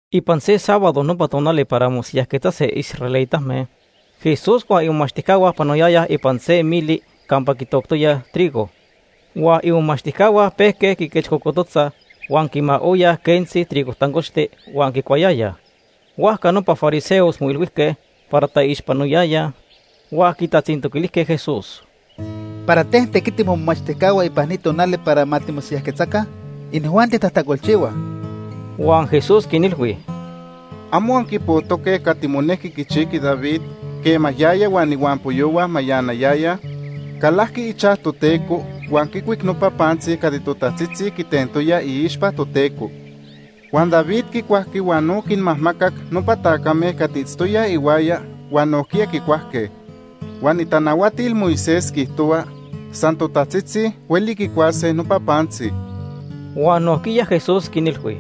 Ipan se sábado, nopa tonali para mosiyajquetzase israelitame, Jesús huan imomachtijcahua panoyayaj ipan se mili campa quitoctoyaj trigo. Huan imomachtijcahua pejque quiquechcocototzaj huan quimaoyaj quentzi trigo tancochti huan quicuayayaj. Huajca nopa fariseos moilhuijque para taixpanoyayaj huan quitatzintoquilijque Jesús: ―¿Para ten tequitij momomachtijcahua ipan ni tonali para ma timosiyajquetzaca? Inijuanti tajtacolchihuaj. Huan Jesús quinilhui: ―¿Amo anquipojtoque cati monejqui quichijqui David quema yaya huan ihuampoyohua mayanayayaj? Calajqui ichaj Toteco huan quicuic nopa pantzi cati totajtzitzi quitentoyaj iixpa Toteco. Huan David quicuajqui huan no quinmajmacac nopa tacame cati itztoyaj ihuaya huan nojquiya quicuajque. Huan itanahuatil Moisés quiijtohua, san totajtzitzi hueli quicuase nopa pantzi. Huan nojquiya Jesús quinilhui: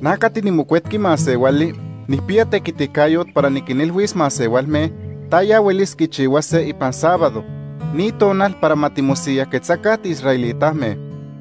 ―Na cati niMocuetqui Masehuali nijpiya tequiticayot para niquinilhuis masehualme taya huelis quichihuase ipan sábado, ni tonal para ma timosiyajquetzaca tiisraelitame.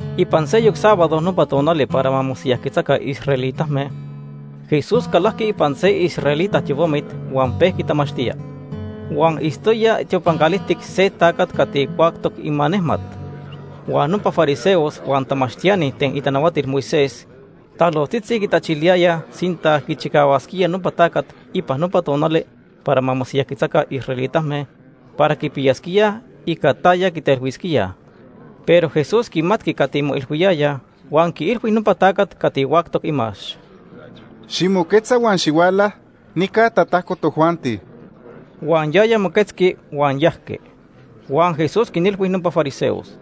Ipan seyoc sábado, nopa tonali para ma mosiyajquetzaca israelitame, Jesús calajqui ipan se israelita tiopamit huan pejqui tamachtía. Huan itztoya tiopan calijtic se tacat cati huactoc imanejmat. Huan nopa fariseos huan tamachtiani ten itanahuatil Moisés talojtzitzi quitachiliyayaj sinta quichicahuasquía nopa tacat ipan nopa tonali para mosiyajquetzase israelitame para quipiyasquíaj ica taya quitelhuisquíaj. Pero Jesús quimatqui cati moilhuiyayaj huan quiilhui nopa tacat cati huactoc imax: ―Ximoquetza huan xihuala nica tatajco tojuanti. Huan yaya moquetzqui huan yajqui. Huan Jesús quinilhui nopa fariseos: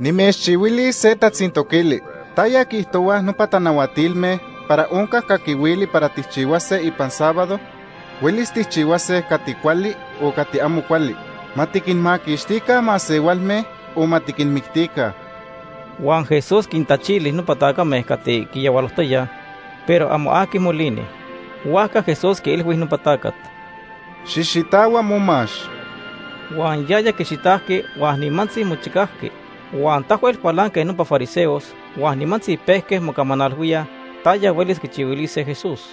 ―Nimechchihuilis se tatzintoquili: ¿Taya quiijtohuaj nopa tanahuatilme para onca caquihuili para tijchihuase ipan sábado? ¿Huelis tijchihuase cati cuali o cati amo cuali? ¿Ma tiquinmaquixtica masehualme o ma tiquinmictica? Huan Jesús quintachili nopa tacame cati quiyahualojtoyaj, pero amo aqui molini. Huajca Jesús quiilhui nopa tacat: ―Xijxitahua momax. Huan yaya quixitajqui huan nimantzi mochicajqui. Huan tahuel cualanque nopa fariseos huan nimantzi pejque mocamanalhuíaj taya huelis quichihuilise Jesús.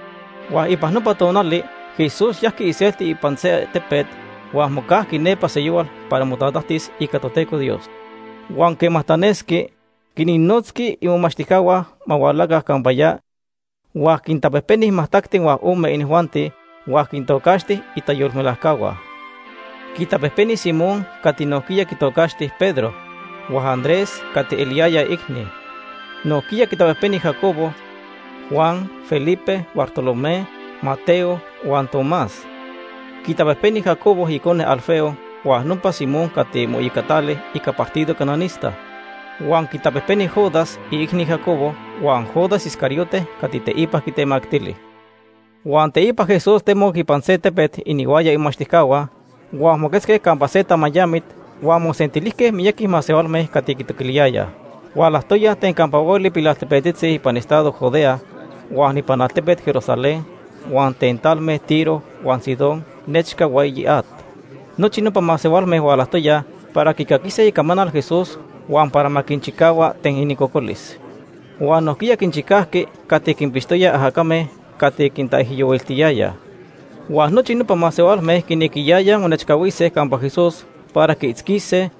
Huan ipan nopa tonali Jesús yajqui iselti ipan se tepet huan mocajqui nepa seyohual para motatajtis ica Toteco Dios. Huan quema tanesqui, quinnotzqui imomachtijcahua ma hualaca campa ya huan quintapejpeni majtacti huan ome inijuanti huan quintocaxti itayolmelajcahua. Quitapejpeni Simón cati nojquiya quitocaxti Pedro, huan Andrés cati eliyaya iicni. Nojquiya quintapejpeni Jacobo, Juan, Felipe, Bartolomé, Mateo huan Tomás. Quitapejpeni Jacobo icone Alfeo huan nopa Simón cati moiyocatali ica partido cananista. Huan quitapejpeni Judas, iicni Jacobo huan Judas Iscariote cati teipa quitemactili. Huan teipa Jesús temoc ipan tepet inihuaya imomachtijcahua, huan moquetzque campa se tamayamit huan mosentilijque miyaqui masehualme cati quitoquiliyayaj. Hualajtoyaj ten campa hueli pilaltepetzitzi ipan estado Judea huan ipan altepet Jerusalén huan ten talme Tiro huan Sidón nechca hueyi at. Nochi nopa masehualme hualajtoyaj para quicaquise icamanal Jesús huan para ma quinchicahua ten inincocolis. Huan nojquiya quinchicajqui cati quinpixtoyaj ajacame cati quintaijyohuiltiyayaj. Huan nochi nopa masehualme quinequiyayaj monechcahuise campa Jesús para quiitzquise,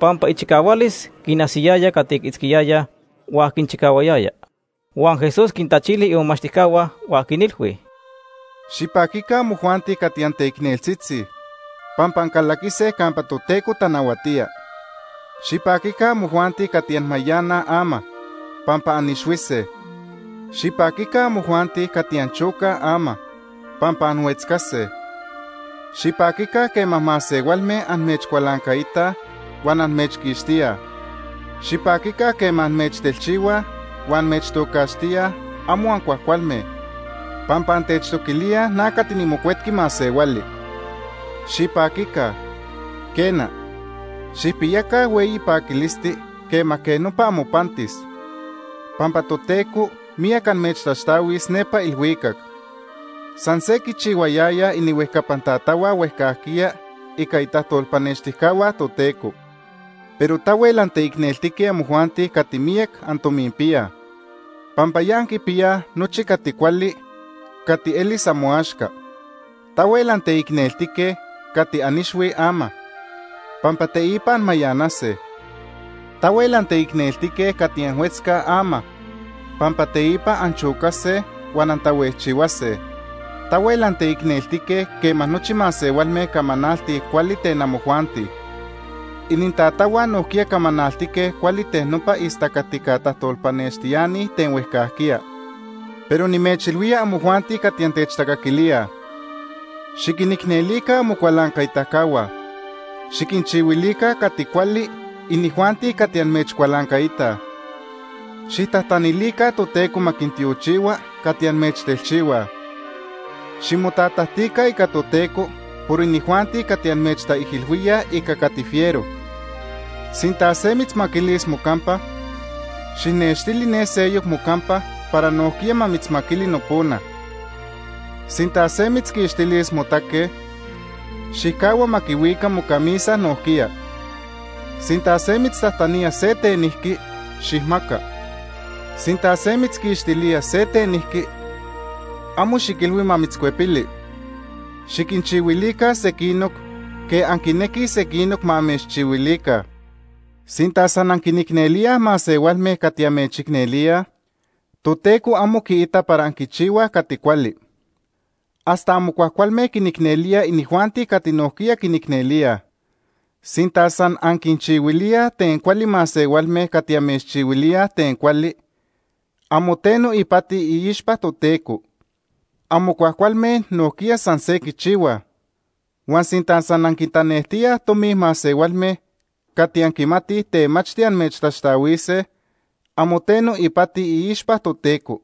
pampa ichicahualis quinajsiyaya cati quiitzquiyayaj huan quinchicahuayaya. Huan Jesús quintachili imomachtijcahua huan quinilhui: “Xipaquica amojuanti cati anteicneltzitzi, pampa ancalaquise campa Toteco tanahuatía. Xipaquica amojuanti cati anmayanaj ama, pampa anixhuise. Xipaquica amojuanti cati anchocaj ama, pampa anhuetzcase. Xipaquica quema masehualme amechcualancaitaj huan amechquixtíaj. Xipaquica quema amechtelchihuaj huan amechtocaxtíaj amo ancuajcualme, pampa antechtoquilíaj na cati niMocuetqui Masehuali. Xipaquica, quena, xijpiyaca hueyi paquilisti quema quej nopa amopantis, pampa Toteco miyac amechtaxtahuis nepa ilhuicac. San se quichihuayayaj inihuejcapan tatahua huejcajquiya ica itajtolpanextijcahua Toteco. Pero tahuel anteicneltique amojuanti cati miyac antominpiyaj, pampa ya anquipiyaj nochi cati cuali cati elis amoaxca. Tahuel anteicneltique cati anixhuij ama, pampa teipa anmayanase. Tahuel anteicneltique cati anhuetzcaj ama, pampa teipa anchocase huan antahuejchihuase. Tahuel anteicneltique quema nochi masehualme camanaltij cuali ten amojuanti. Inintatahua nojquiya camanaltique cuali ten nopa istacatica tajtolpanextiani ten huejcajquiya. “Pero nimechilhuía amojuanti cati antechtacaquilíaj: Xiquinicnelica amocualancaitacahua. Xiquinchihuilica cati cuali inijuanti cati amechcualancaitaj. Xijtajtanilica Toteco ma quintiochihua cati amechtelchihuaj. Ximotatajtica ica Toteco por inijuanti cati amechtaijilhuíaj ica cati fiero. Sinta se mitzmaquilis mocampa, xijnextili ne seyoc mocampa para nojquiya ma mitzmaquili nopona. Sinta se mitzquixtilis motaque, xijcahua ma quihuica mocamisa nojquiya. Sinta se mitztajtanía se tenijqui, xijmaca. Sinta se mitzquixtilía se tenijqui, amo xiquilhui ma mitzcuepili. Xiquinchihuilica sequinoc quej anquinequij sequinoc ma amechchihuilica. “Sinta san anquinicnelíaj masehualme cati amechicnelíaj, Toteco amo quiita para anquichihuaj cati cuali. Hasta amo cuajcualme quinicnelíaj inijuanti cati nojquiya quinicnelíaj. Sinta san anquinchihuilíaj ten cuali masehualme cati amechchihuilíaj ten cuali, amo teno ipati iixpa Toteco. Amo cuajcualme nojquiya san se quichihuaj. Huan sinta san anquintanejtíaj tomi masehualme cati anquimatij temachti amechtaxtahuise, amo teno ipati iixpa Toteco,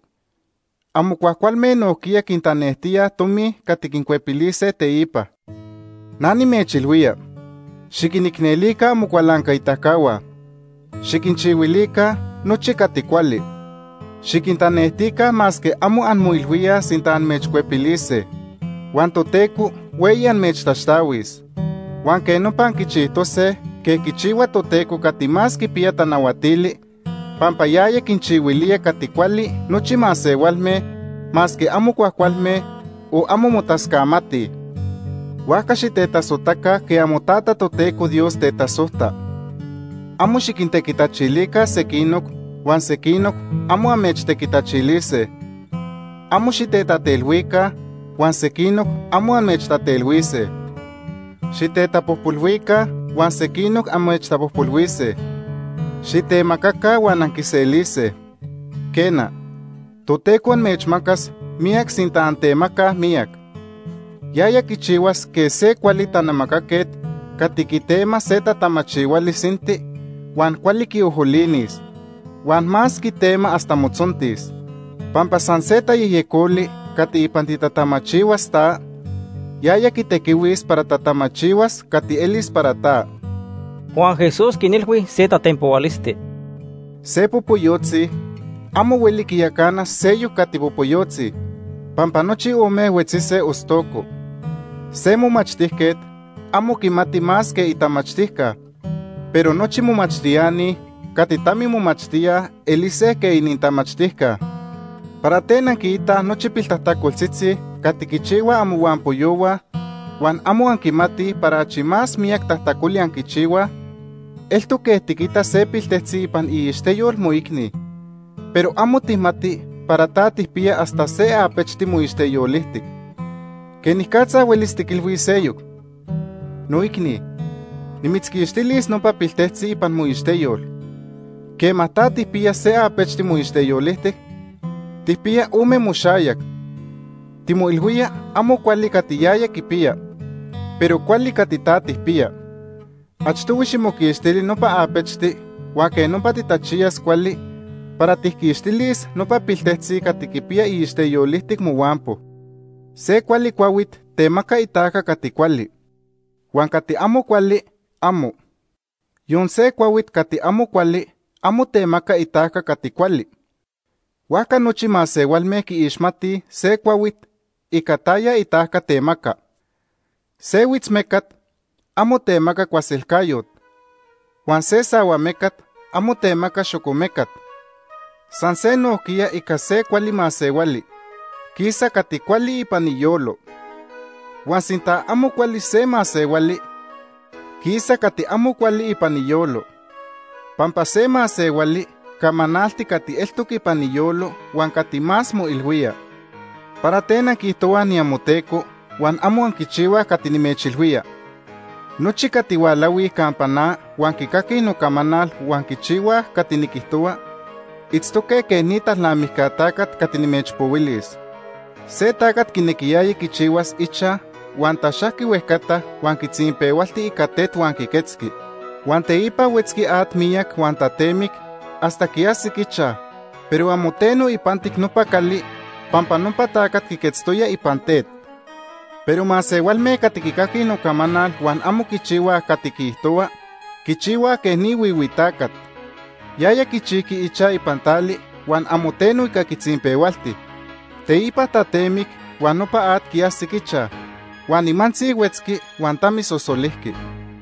amo cuajcualme nojquiya quintanejtíaj tomi cati quincuepilise teipa. Na nimechilhuía, xiquinicnelica amocualancaitacahua. Xiquinchihuilica nochi cati cuali. Xiquintanejtica masque amo anmoilhuíaj sinta amechcuepilise. Huan Toteco hueyi amechtaxtahuis. Huan quej nopa anquichijtose quej quichihua Toteco Cati Más Quipiya Tanahuatili, pampa yaya quinchihuilía cati cuali nochi masehualme, masque amo cuajcualme o amo motascamatij. Huajca xitetasojtaca quej amoTata, Toteco Dios, tetasojta. “Amo xiquintequitachilica sequinoc, huan sequinoc amo amechtequitachilise. Amo xitetatelhuica, huan sequinoc amo amechtatelhuise. Xitetapojpolhuica, huan sequinoc amechtapojpolhuise. Xitemacaca huan anquiselise. Quena, Toteco amechmacas miyac sinta antemacaj miyac. Yaya quichihuas quej se cuali tanamacaquet cati quitema se tatamachihuali sinti, huan cuali quiojolinis, huan más quitema hasta motzontis. Pampa san se tayejyecoli cati ipan titatamachihuas ta, yaya quitequihuis para tatamachihuas cati elis para ta.” Huan Jesús quinilhui se tatenpohualisti: “Se popoyotzi amo hueli quiyacana seyoc cati popoyotzi, pampa nochi ome huetzise ostoco. Se momachtijquet amo quimati más que itamachtijca, pero nochi momachtiani cati tamimomachtíaj elise quej inintamachtijca. “¿Para ten anquiitaj nochi piltajtacoltzitzi cati quichihuaj amohuampoyohua huan amo anquimatij para achi más miyac tajtacoli anquichihuaj? Eltoc quej tiquita se piltejtzi ipan iixteyol moicni, pero amo tijmati para ta tijpiya hasta se apechti moixteyolijtic. ¿Quenicatza huelis tiquilhuis seyoc: ‘Noicni, nimitzquixtilis nopa piltejtzi ipan moixteyol’, quema ta tijpiya se apechti moixteyolijtic? Tijpiya ome moxayac. Timoilhuía amo cuali cati yaya quipiya, pero cuali cati ta tijpiya. Achtohui ximoquixtili nopa apechti huan quej nopa titachiyas cuali para tijquixtilis nopa piltejtzi cati quipiya iixteyolijtic mohuampo. “Se cuali cuahuit temaca itajca cati cuali, huan cati amo cuali, amo. Yon se cuahuit cati amo cuali amo temaca itajca cati cuali. Huajca nochi masehualme quiixmatij se cuahuit ica taya itajca temaca. Se huitzmecat amo temaca cuaselcayot. Huan se sahuamecat amo temaca xocomecat. San se nojquiya ica se cuali masehuali, quisa cati cuali ipan iyolo. Huan sinta amo cuali se masehuali, quisa cati amo cuali ipan iyolo. Pampa se masehuali camanalti cati eltoc ipan iyolo huan cati más moilhuía. “¿Para ten anquiijtohuaj niamoTeco huan amo anquichihuaj cati nimechilhuía? Nochi cati hualahuij campa na huan quicaquij nocamanal huan quichihuaj cati niquijtohua, itztoque quej ni talnamijca tacat cati nimechpohuilis. Se tacat quinequiyaya quichihuas ichaj huan taxajqui huejcata huan quitzinpehualti ica tet huan quiquetzqui. Huan teipa huetzqui at miyac huan tatemic hasta quiajsic ichaj, pero amo teno ipantic nopa cali pampa nopa tacat quiquetztoya ipan tet. Pero masehualme cati quicaquij nocamanal huan amo quichihuaj cati quiijtohua, quichihuaj quej ni huihui tacat. Yaya quichijqui ichaj ipan tali huan amo teno ica quitzinpehualti. Teipa tatemic huan nopa at quiajsic ichaj, huan nimantzi huetzqui huan tamisosolijqui.”